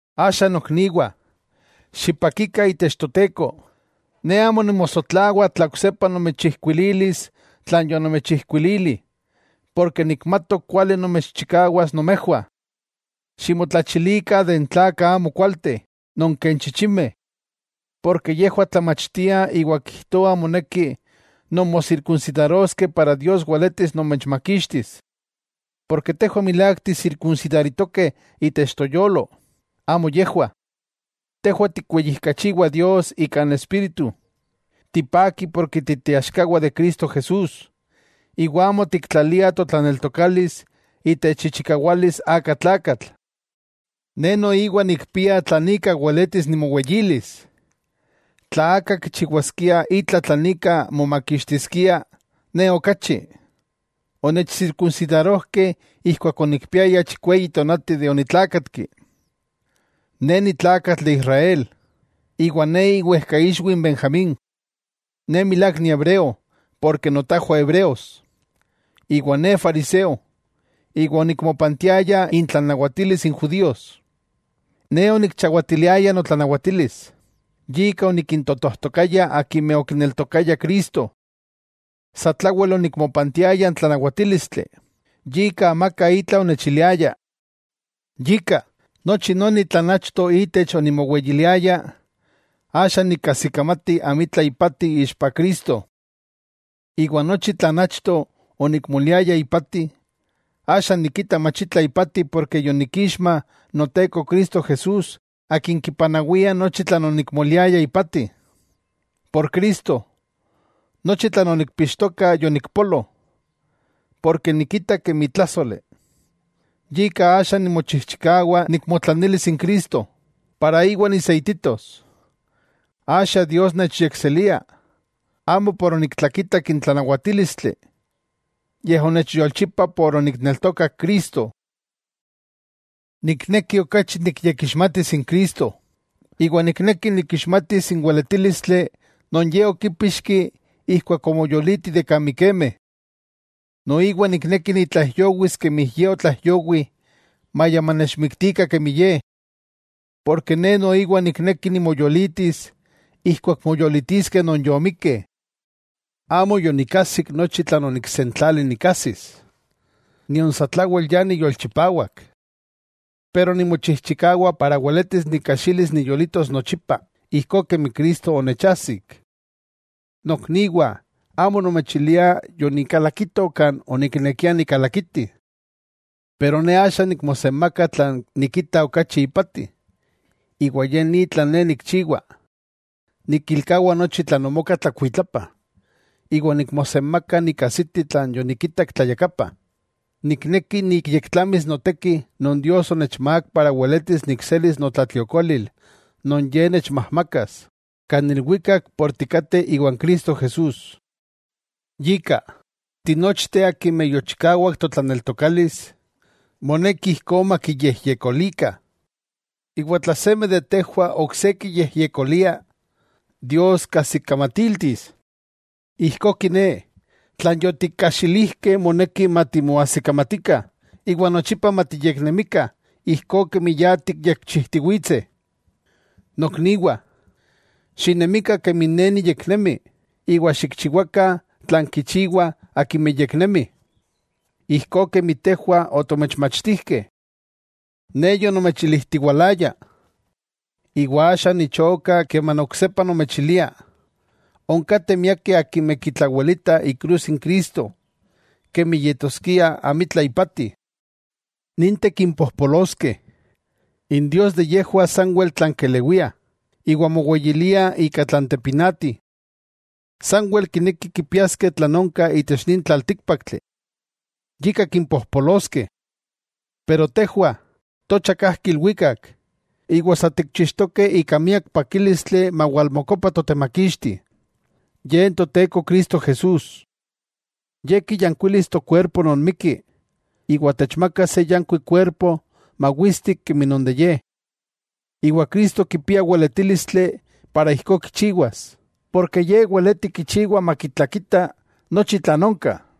Axa nokniwah, xipakikah itech Toteko. Ne amo nimosotlawa tla oksepa nomechijkuililis tlan yonomechijkuilili, porke nikmatok kuali nomechchikawas nomejwah. Ximotlachilikah de n tlakah amokualteh, non ken chichimeh. Yejwah tlamachtiah iwa kijtoah moneki nonmosirkunsidaroskeh para Dios weletis nomechmakixtis. Porke tejwah milák tisirkunsidaritokeh itech toyolo, amo yejwah. Tejwah tikweyijkachiwah Dios ika n Espíritu, tipakih porke titeaxkawah de Cristo Jesús, iwa amo tiktlalia totlaneltokalis itech ichikawalis aka tlakatl. Ne noiwa nikpia tlan ika weletis nimoweyilis. Tla aka kichiwaskia itla tlan ika momakixtiskia, ne okachi. Onechsirkunsidarojkeh ijkuak onikpiaya chikweyi tonati de onitlakatki. Ne ni tlakatl de Israel, iwa ne iwejkaixwi n Benjamín. Ne milák ni hebreo notajwah hebreos. Iwa ne fariseo, iwa onikmopantiaya intlanawatilis n judíos. Ne onikchawatiliaya notlanawatilis, yika onikintotojtokaya akimeh okineltokayah Cristo. Satlawel onikmopantiaya n tlanawatílistli, yika amaka itla onechiliaya. Yika, nochi noni tlan achto itech onimoweyiliaya, axa nikajsikamati amitla ipati ixpa Cristo. Iwa nochi tlan achto onikmoliaya ipati, axa nikita mach itla ipati porke yonikixma Noteko Cristo Jesús Akin kipanawia nochi tlan onikmoliaya ipati. Por Cristo, nochi tlan onikpixtoka yonikpolo. Porke nikita kemi tlájsoli, yika axa nimochijchikawa nikmotlanilis n Cristo para Íwa niseititos. Axa Dios nechyekselia, amo por oniktlakitak n tlanawatílistli, yej onechyolchipa por onikneltokak Cristo. Nikneki okachi nikyekixmatis n Cristo, iwa nikneki nikixmatis n weletílistli non Ye okípixki ijkuak omoyoliti de kan mikemeh. Noiwa nikneki nitlaijyowis kemi Ye otlaijyowi maya manechmiktikah kemi Ye. Porke ne noiwa nikneki nimoyolitis ijkuak moyolitiskeh non yomikkeh. Amo yonikajsik nochi tlan oniksentlali nikajsis, nion satlawel ya niyolchipawak. Pero nimochijchikawa weletis nikajxilis niyolitos nochipa ijkó kemi Cristo onechajsik. Nokniwah, amo nomechilia yonikalakito kan oniknekia nikalakiti. Pero ne axa nikmosenmaka tlan nikita okachi ipati, iwa ye ni tlan ne nikchiwa, nikilkawa nochi tlan omoka tlakuitlapa, iwa nikmosenmaka nikajsiti tlan yonikitak tlayakapa. Nikneki nikyektlamis noteki non Dios onechmák para weletis nikselis notlatliokolil non Ye techmajmakas kan ilwikak por tikateh iwan Cristo Jesús. Yika, tinochteh akimeh yochikawak totlaneltokalis, moneki ijkó matikyejyekolikah. Iwa tla seme de tejwah ok se kiyejyekolia, Dios kajsikamatiltis. Ijkó kiné, tlan yotikajxilijkeh moneki matimoajsikamatikah iwa nochipa matiyeknemikah ijkó kemi ya tikyekchijtiwitseh. Nokniwah, xinemikah kemi ne niyeknemi, iwa xikchiwakah tlan kichiwah akimeh yeknemih, ijkó kemi tejwah otomechmachtijkeh. Ne yonomechilijtiwalaya, iwa axa nichoka keman oksepa nomechilia, onkateh miakeh akimeh kitlawelitah ikrus n Cristo kemi yetoskia amitla ipati. Ninteh kimpojpoloskeh. N dios de yejwah sanwel tlan kelewia, iwa moweyiliah ika tlan tepinati. Sanwel kinekih kipiaskeh tlan onka itech nin tlaltíkpaktli. Yika kimpojpoloskeh. Pero tejwah, tocha kajki ilwikak, iwa sa tikchixtokeh ika miak pakílistli mawalmokopa Totemakixti, Ye Toteko Cristo Jesús. Ye kiyankuilis tokuerpo non mikki, iwa techmakas se yankuik kuerpo mawistik kemi non de Ye. Cristo kipia weletílistli para ijkó kichiwas, porke Ye weleti kichiwa makitlakita nochi tlan onka.